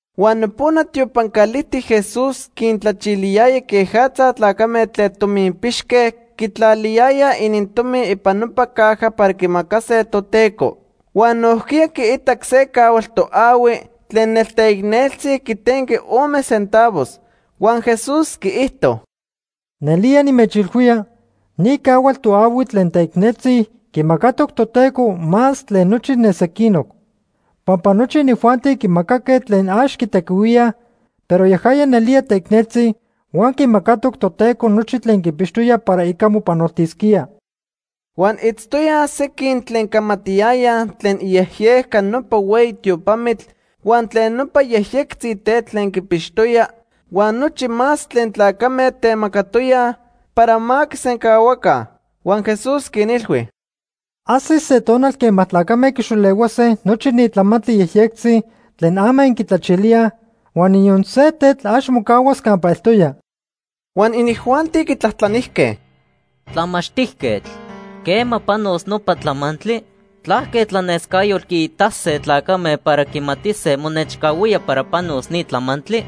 Huan nopona tiopan calijtic Jesús quintlachiliyaya quejatza tlacame tlen tominpixque quitlaliyayaj inintomi ipan nopa caja para quimacase Toteco. Huan nojquiya quiitac se cahual toahui tlen nelteicneltzi quitenqui ome centavos. Huan Jesús quiijto: ―Nelía nimechilhuía ni cahual toahui tlen teicneltzi quimacatoc Toteco más tlen nochi ne sequinoc. Pampa nochi inijuanti quimacaque tlen ax quitequihuíaj, pero yajaya nelía teicneltzi, huan quimacatoc Toteco nochi tlen quipixtoya para ica mopanoltisquía. Huan itztoyaj sequin tlen camatiyayaj tlen iyejyejca nopa hueyi tiopamitl huan tlen nopa yejyectzi tetl tlen quipixtoya huan nochi más tlen tlacame temacatoyaj para ma quisencahuaca. Huan Jesús quinilhui: ―Ajsis se tonal quema tlacame quixolehuase nochi ni tlamantli yejyectzi tlen ama inquitlachilíaj, huan niyon se tetl ax mocahuas campa eltoya. Huan inijuanti quitlajtlanijque: ―Tlamachtijquetl, ¿quema panos nopa tlamantli? ¿Tlaque tlanescayotl quiitase tlacame para quimatise monechcahuía para panos ni tlamantli?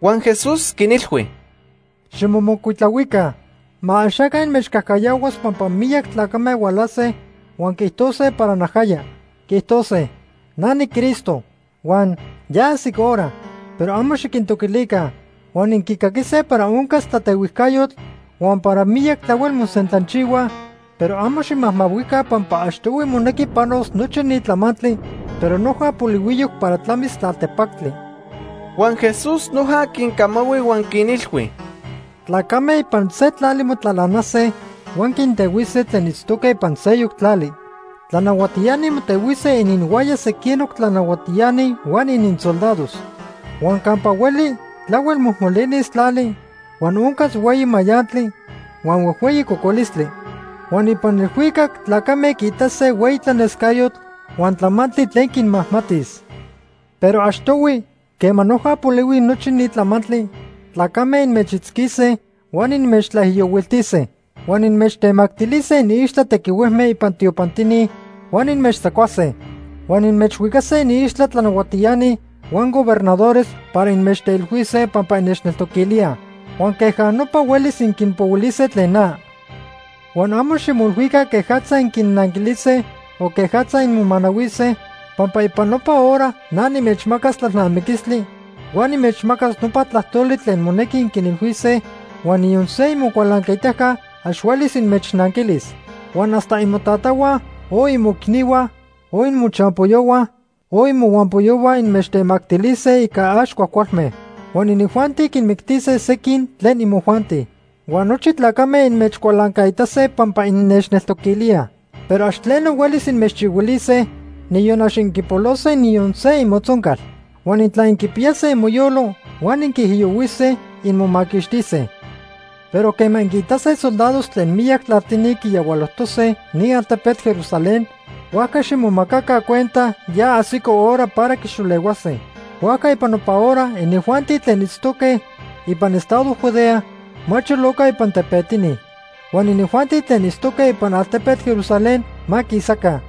Huan Jesús quinilhui: “Ximomocuitlahuica. Ma axaca inmechcajcayahuas pampa miyac tlacame hualase huan quiijtose para najaya. Quiijtose: ‘Na niCristo’, huan ‘Ya ajsic hora’, pero amo xiquintoquilica. Huan inquicaquise para oncas tlatehuijcayotl huan para miyac tlahuel mosentlanchihuaj, pero amo ximajmahuica pampa achtohui monequi panos nochi ni tlamantli, pero noja polihuiyoc para tlamis tlaltepactli.” Huan Jesús noja quincamahui huan quinilhui: “Tlacame ipan se tlali motlalanase huan quintehuise tlen itztoque ipan seyoc tlali. Tlanahuatiani motehuise ininhuaya sequinoc tlanahuatiani huan ininsoldados. Huan campa hueli tlahuel mojmolinis tlali, huan oncas hueyi mayantli, huan huejhueyi cocolistli. Huan ipan elhuicac tlacame quiitase hueyi tlanescayotl huan tlamantli tlen quinmajmatis. “Pero achtohui, quema noja polihui nochi ni tlamantli, tlacame inmechitzquise huan inmechtlaijiyohuiltise. Huan inmechtemactilise iniixtla tequihuejme ipan tiopantini, huan inmechtzacuase. Huan inmechhuicase iniixtla tlanahuatiani huan gobernadores para inmechteilhuise pampa innechneltoquilíaj. Huan queja nopa huelis inquinpohuilise tlen na. Huan amo ximoilhuica quejatza inquinnanquilise o quejatza inmomanahuise, pampa ipan nopa hora na nimechmacas tlalnamiquistli huan nimechmacas nopa tlajtoli tlen monequi inquinilhuise, huan niyon se imocualancaitaca ax huelis inmechnanquilis. Huan hasta imotatahua, o imoicnihua, o imochampoyohua o imohuampoyohua inmechtemactilise ica ax cuajcualme. Huan inijuanti quinmictise sequin tlen imojuanti. Huan nochi tlacame inmechcualancaitase pampa innechneltoquilíaj. Pero ax tleno huelis inmechchihuilise, niyon ax inquipolose niyon se imotzoncal. Huan intla inquipiyase imoyolo huan inquiijiyohuise, inmomaquixtise. “Pero quema inquiitase soldados tlen miyac tlaltini quiyahualojtose ni altepetl Jerusalén, huajca ximomacaca cuenta ya ajsico hora para quixolehuase. Huajca ipan nopa hora, inijuanti tlen itztoque ipan estado Judea ma choloca ipan tepetini. Huan inijuanti tlen itztoque ipan altepetl Jerusalén ma quisaca.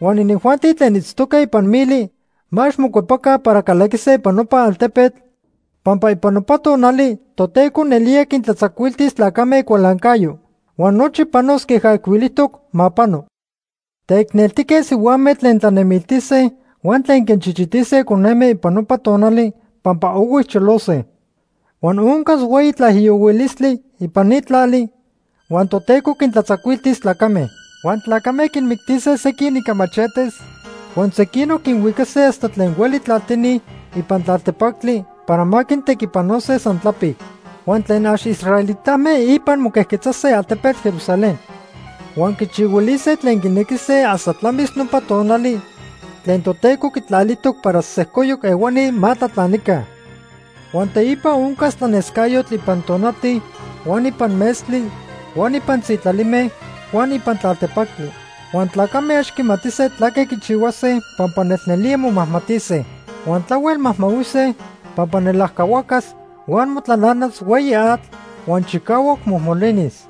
Huan inijuanti tlen itztoque ipan mili ma ax mocuepaca para calaquise ipan nopa altepetl, pampa ipan nopa tonali Toteco nelía quintlatzacuiltis tlacame icualancayo. Huan nochi panos queja ijcuilijtoc ma pano. Teicneltique sihuame tlen tlanemiltise huan tlen quinchichitise coneme ipan nopa tonali pampa ohui cholose. Huan oncas hueyi tlaijiyohuilistli ipan ni tlali, huan Toteco quintlatzacuiltis tlacame. Huan tlacame quinmictise sequin ica machetes huan sequinoc quinhuicase hasta tlen hueli tlaltini ipan tlaltepactli para ma quintequipanose san tlapic. Huan tlen ax israelitame ipan moquejquetzase altepetl Jerusalén. Huan quichihuilise tlen quinequise hasta tlamis nopa tonali tlen Toteco quitlalijtoc para sejcoyoc ehuani ma tlatlanica. “Huan teipa oncas tlanescayotl ipan tonati huan ipan metztli huan ipan sitlalime huan ipan tlaltepactli. Huan tlacame ax quimatise tlaque quichihuase pampa nelnelía momajmatise. Huan tlahuel majmahuise pampa nelajcahuacas huan motlalanas hueyi atl huan chicahuac mojmolinis.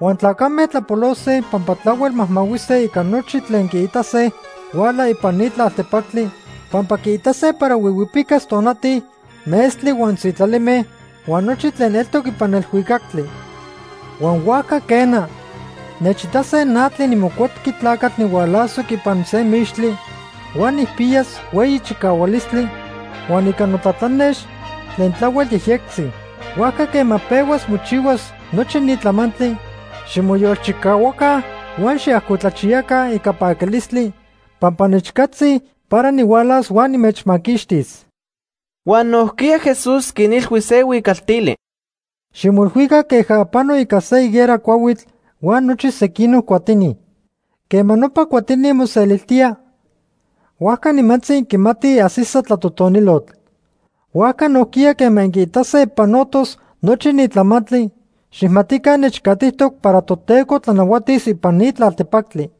Huan tlacame tlapolose pampa tlahuel majmahuise ica nochi tlen quiitase huala ipan ni tlaltepactli, pampa quiitase para huihuipicas tonati, metztli huan sitlalime huan nochi tlen eltoc ipan elhuicactli. Huan huajca quena, nechitase na tlen niMocuepqui Tlacatl nihualasoc ipan se mixtli, huan nijpiyas hueyi chicahualistli, huan ica notlatlanex tlen tlahuel yejyectzi. Huajca quema pehuas mochihuas nochi ni tlamantli, ximoyolchicahuaca huan xiajcotlachiyaca ica paquilistli pampa nechcatzi para nihualas huan nimechmaquixtis.” Huan nojquiya Jesús quinilhui se huicaltili: “Ximoilhuica queja pano ica se higuera cuahuitl huan nochi sequinoc cuatini. Quema nopa cuatini moseliltía, huajca nimantzi inquimatij ajsisa tlatotonilotl. Huajca nojquiya quema inquiitase panotos nochi ni tlamantli, xijmatica nechcatitoc para Toteco tlanahuatis ipan ni tlaltepactli.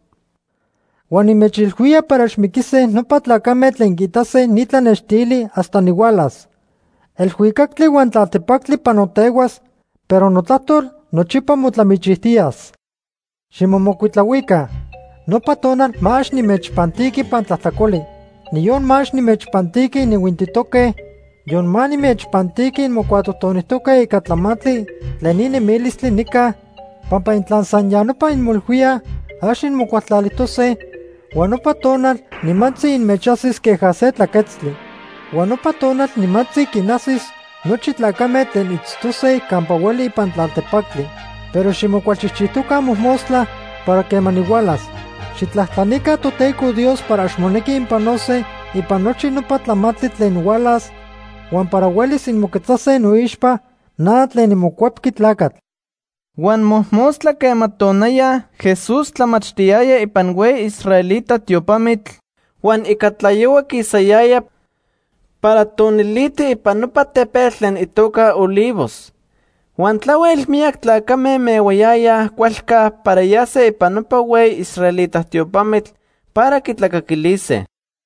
“Huan nimechilhuía para ax miquise nopa tlacame tlen quiitase ni tlanextili hasta nihualas. Elhuicactli huan tlaltepactli panotehuas, pero notlajtol nochipa motlamichijtiyas. “Ximomocuitlahuica. Nopa tonal ma ax inmechpantiqui ipan tlajtlacoli. Niyon ma ax nimechpantiqui inihuintitoque, yon ma nimechpantiqui inmocuatotonijtoque ica tlamantli tlen ni nemilistli nica, pampa intla san ya nopa inmoilhuíaj, ax inmocualtlalijtose, huan nopa tonal nimantzi inmechajsis queja se tlaquetztli. Huan nopa tonal nimantzi quinajsis nochi tlacame tlen itztose campa hueli ipan tlaltepactli. Pero ximocualchijchijtoca mojmostla para quema nihualas. Xijtlajtlanica Toteco Dios para ax monequi inpanose ipan nochi nopa tlamantli tlen hualas huan para huelis inmoquetzase noixpa na tlen niMocuepqui Tlacatl.” Huan mojmostla quema tonaya Jesús tlamachtiyaya ipan hueyi israelita tiopamitl huan ica tlayohua quisayaya para toniliti ipan nopa tepetl tlen itoca Olivos. Huan tlahuel miyac tlacame mehuayayaj cualca para yase ipan nopa hueyi israelita tiopamitl para quitlacaquilise.